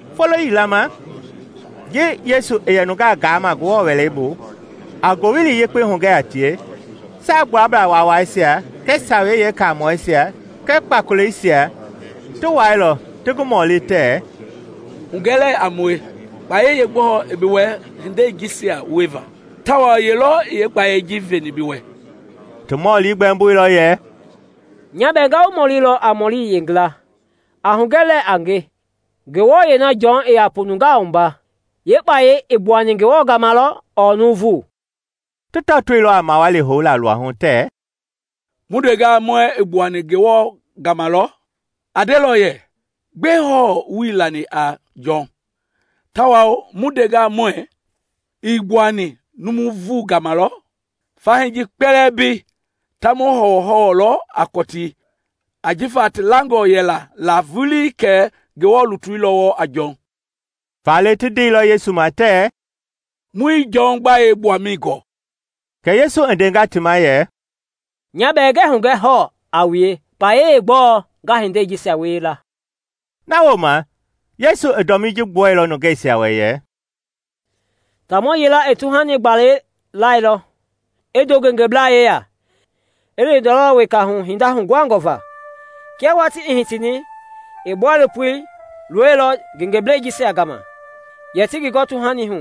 Folo yila ma, ji Yesu i yɛ nungaa gaama Ngewɔ Wɛlei bu, a Ngowili Yekpei hugɛ a tie, Saagbuablaa Waawaisia kɛɛ Sawei Yeekamɔɛisia kɛɛ kpakoleisia ti wuailɔ, ti ngi mɔli tɛɛ, “Hugɛ lɛɛ a mue, kpayɛi yeegbɔɔ i bi wɛ hindei jisia wieva, tawao ye lɔ i yeekpayei ji veni bi wɛ?” I ti mɔli gbɛmboilɔ yɛ, “Nya bɛɛ nga wu mɔlilɔ a mɔli yila; a hugɛ lɛɛ a nge, Nguɛi na Jɔn i yɛ nungaa wua la yeekpayei i gbuani Ngewɔ gama lɔ ɔɔ nuuvu?” Ti tɔtoilɔ a mawali houla luahu tɛɛ, “Mu ndengaa muɛɛ ‘I gbuani Ngewɔ gama lɔ,’ a ndelɔ yɛ, ‘Gbɛe hɔɔ wuii lani a Jɔn?’ Tawao mu ndengaa muɛɛ ‘I gbuani nuuvu gama lɔ,’ fahii ji kpɛlɛɛ mbei ta mu hɔwɔhɔwɔlɔ a kɔtii; ajifa ti langɔ yɛla la vulii kɛ Ngewɔ lutui lɔ wɔɔ a Jɔn.” Faale ti ndeilɔ Yesu ma tɛɛ, “Muii Jɔn gbayei gbuamɛi gɔɔ.” Kɛ Yesu i ndenga ti ma yɛ, “Nya bɛɛ ngɛɛ hugɛ hɔɔ a wue kpayei yeegbɔɔ nga hindei jisia wie la.” Na wooma Yesu i dɔmii ji gbuɛilɔ nungeisia wɛ yɛ, “Taamɔ yila i tuhani gbala lɛilɔ, i ndo ngengeblaa yeya, i li ndɔlɔ weka hu hinda huguhangɔ va. Kia watii i hitini, i bɔilopo loilɔ ngengeblɛisia gama yɛ ti ngi gɔ tuhani hu;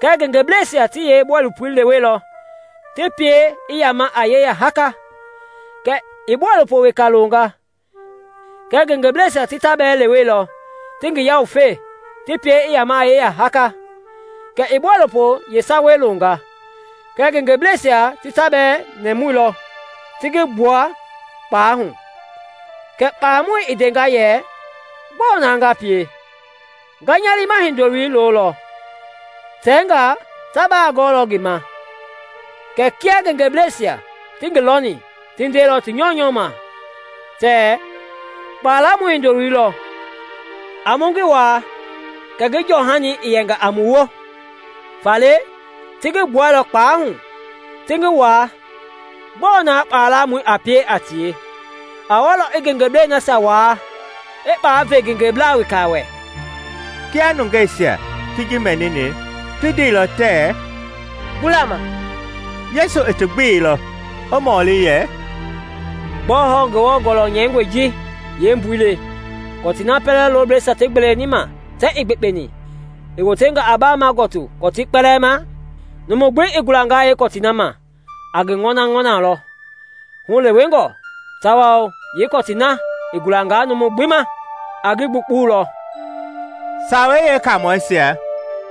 kɛɛ ngengeblɛisia ti yeebɔilopoi leweilɔ, ti pie i yama a yeya haaka. Kɛ i bɔilopo weka longa; kɛɛ ngengeblɛisia ti ta bɛɛ leweilɔ, ti ngi yawufe, ti pie i yama a yeya haaka. Kɛ i bɔilopoi yeesawei longa; kɛɛ ngengeblɛisia ti ta bɛɛ nɛmuilɔ, ti ngi gbua kpalɛi hu. Kɛ kpalamɔi i ndenga yɛ, ‘Gbɔɔ na nga pie? Nga nya liima hindoloi lolɔ; tɛngaa ta ba gɔlɔ ngi ma.’ Kɛɛ kia ngengeblɛisia ti ngi lɔni, ti ndeilɔ ti nyɔunyɔu ma tɛɛ, ‘Kpalamɔi hindoloi lɔ. A mu ngi waa kɛ ngi jɔhani i yɛnga a mu woo!’ Faale ti ngi gbuɛilɔ kpalɛi hu, ti ngi waa. “Gbɔɔ na kpalamɔi a pie a tie? A walɔ i ngengeblɛi nasia waa, i kpalɛi ve ngengeblaa weka wɛ.” Kia nungeisia ti ji mɛnini, ti ndeilɔ tɛɛ “Gbula ma!” Yesu i ti gbeilɔ, i mɔli yɛ, “Gbɔɔ hɔɔ Ngewɔ Gɔlɔ nyɛingɔi ji yeembui le: ‘Kɔtii na pɛlɛ loblɛisia ti gbeeleni ma tɛɛ ii yekpeni, i wotenga a baama gɔtii kɔtii kpɛlɛɛ ma?’ Numu gbi i gulangaa yeekɔtii na ma, a ngi ŋɔnaŋɔnalɔ hulewengɔ, tawao yeekɔtii na i gulangaa numu gbi ma, a ngi gbuukpulɔ.” Sawei Yeekaamɔisia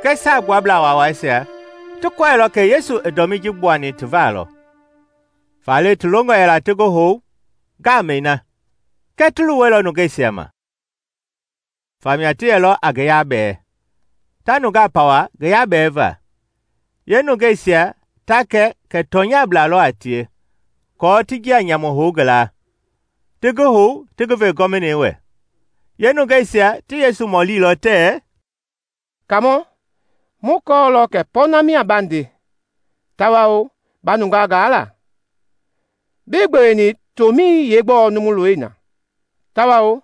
kɛɛ Saagbuablaa Waawaisia ti kɔɛilɔ kɛ Yesu i dɔmii ji gbuani ti va lɔ, faale ti longɔ yɛla ti ngi hou ngamɛi na kɛɛ ti luwɛilɔ nungeisia ma. Famia ti yɛlɔ a ngi yabɛɛ, ta nungaa pawa ngi yabɛva, yeenungeisia ta kɛ kɛ tɔnyablaa lɔ a tie, aako ti njia nyamu hou ngi la, ti ngi hou ti ngi ve Gɔvinei wɛ. Yeenungeisia ti Yesu mɔlilɔ tɛɛ, “Kaamɔ, mu kɔɔlɔ kɛ pɔɔnɛi mia ba nde tawao ba nungaa gaa la; bii gbeweni tomɛi yeegbɔɔ numu i looni na, tawao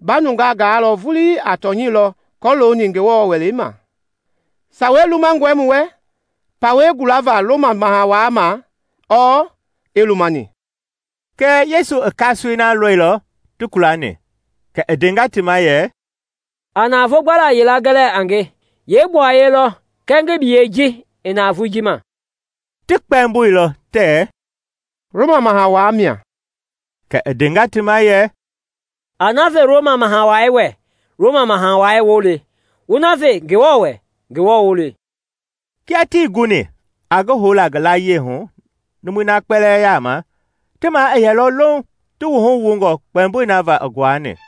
ba nungaa gaa vulii a tɔnyɛi lɔ kɔlooni Ngewɔ welei ma. Sawei lumangɔe mu wɛ pawɛi gulava Roma Maha Wai ma ɔɔ ii lumani?” Kɛɛ Yesu i kasoei na lɔilɔ ti kulani, kɛ i ndenga ti ma yɛ, “A navoo gbala yila gɛ lɛɛ a nge. Yee gbuaye lɔ kɛɛ ngi biyei ji i navoei ji ma?” Ti kpɛmboilɔ tɛɛ “Roma Maha Wai mia.” Kɛ i ndenga ti ma yɛ, “A na ve Roma Maha Wai wɛ Roma Maha Wai woo le, wu na ve Ngewɔ wɛ Ngewɔ woo le.” Kia tii guni a ngi houla ngi layie hu numui na kpɛlɛɛ yaama, ti ma i yɛilɔ louŋ, ti wuhu wungɔ kpɛmboi na va i nguani.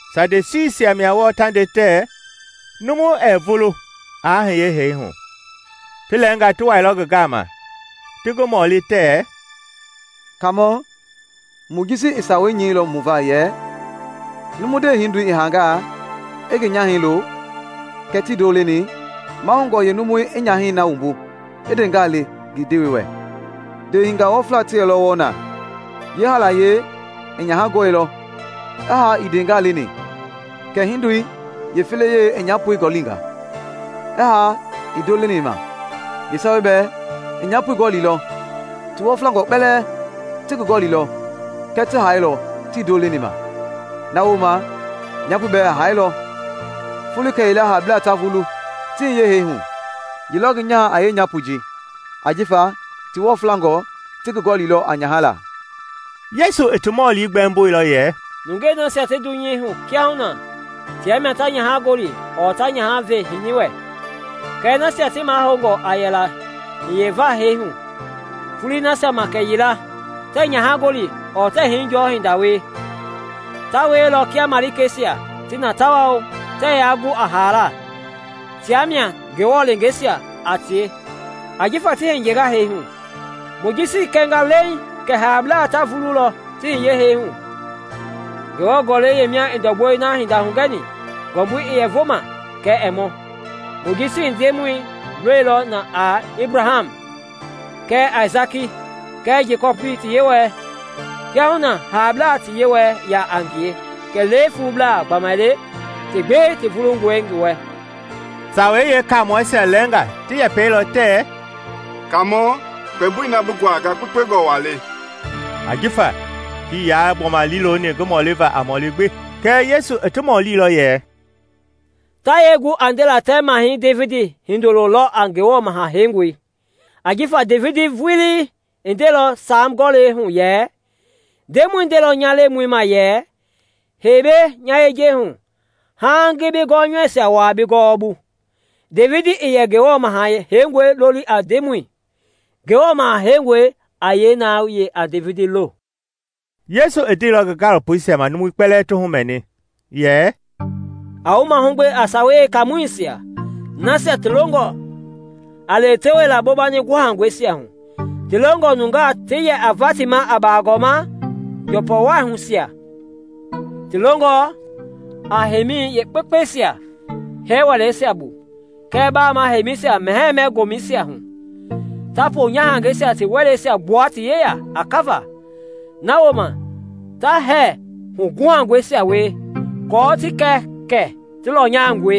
Sadusiisia mia wɔɔ ta nde tɛɛ numu ɛɛ vulu aa hiye hee hu. Ti lɛɛnga ti wailɔ ngi gama, ti ngi mɔli tɛɛ, “Kaamɔ, Mojisi i sawei nyɛilɔ mu va yɛ ‘numu ndewehindoi i hangaa, i ngi nyahɛi lo kɛɛ tii ndo leni, mahoungɔ yeenumui i nyahɛi na wumbu i ndeengaa le ngi ndewei wɛ.’ Ndewehingaa wɔfla ti yɛlɔ wɔɔ na; yeehaalayei i nyaha gɔli, i haa ii ndeengaa leni. Kɛ ndeehindoi yeefelei i nyapoi gɔlinga, i haa ii ndo leni ma. Yeesawei bɛɛ i nyapoi gɔlilɔ. Ti wɔflangɔ kpɛlɛɛ ti ngi gɔlilɔ kɛɛ ti hailɔ tii ndo leni ma. Na wooma, nyapoi bɛɛ i hailɔ. Foloi kɛyila haablaa ta vulu ti hiye hee hu, ye lɔ ngi nyaha a yɛ a nyapoi ji? Ajifa ti wɔflangɔ ti ngi gɔlilɔ a nyaha la.” Yesu i ti mɔli gbɛmboilɔ yɛ, “Nungei nasia ti dunyei hu kiahuna tia mia ta nyaha gɔli ɔɔ ta nyaha ve hini wɛ. Kɛɛ nasia ti mahoungɔ a yɛla hiyeva hee hu foloi nasia ma kɛyila, tɛɛ nyahagɔli ɔɔ hinijɔɔ hinda wie. Ta wielɔ kia malikeisia ti na tawao tɛɛ ya gu a haala. Tia mia Ngewɔ leengeisia a tie, ajifa ti hiyenga hee hu. Mojisi i kɛnga leeŋ kɛ haablaa ta vululɔ ti hiye hee hu. Ngewɔ Gɔlɛi yeemia i ndɔgbɔi na hinda hugɛni ngɔmbui i yɛ vo ma kɛɛ ɛɛ mɔ, Mojisi i Ndemɔi lolilɔ na a ‘Ebraham kɛɛ Aisaki kɛɛ Jekɔpi ti Yewɔɛi.’ Kiahuna haablaa ti Yewɔ ya a ngie kɛlee fuublaa gbamaile ti gbi ti vulungɔe ngi wɛ.” Sawei Yeekaamɔisia lɛɛnga ti yɛpɛilɔ tɛɛ, “Kaamɔ, kpɛmboi na bi nguanga kpekpengɔ wa le!” Ajifa tii ya gbɔma liiloni ngi mɔliva a mɔli gbi. Kɛɛ Yesu i ti mɔlilɔ yɛ, “Ta yee gu a ndela tɛɛ Mahɛi Devidi hindolo lɔ a Ngewɔ Maha Heingɔi? Ajifa Devidi vulii i ndeilɔ Saam Gɔlɛi hu yɛ, ‘Ndemɔi ndeilɔ nya Lemɔi ma yɛ Hei mbei nya yejei hu, Haaŋ ngi bi gɔnyɔuisia wua bi gɔwɔbu.’ Devidi i yɛ Ngewɔ Maha Heingɔi loli a Ndemɔi; Ngewɔ Maha Heingɔi a yee na yɛ a Devidi lo?” Yesu i ndeilɔ ngi gaalopoisia ma, numui kpɛlɛɛ ti humɛni, yɛ, “A wu mahugbe a Sawei Yeekaamɔisia, nasia ti longɔ a lewetewelaa bobani guhakuhɛisia hu, ti longɔ nungaa ti yɛ a va ti ma a bagɔɔma njɔpɔwahuisia, ti longɔ a heimi yeekpekpeisia hɛɛ wɛleisia bu kɛɛ bama heimɛisia mɛhɛɛ-mɛ-gomɛisia hu, ta ponyahangɛisia ti wɛleisia gbua ti yeya a kava, na wooma ta hɛɛ huguhangɔisia wie aako ti kɛ kɛ ti lɔnyangɔe.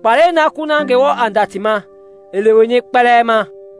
Kpalɛi na kuna Ngewɔ a nda ti ma i leweni kpɛlɛɛ ma.”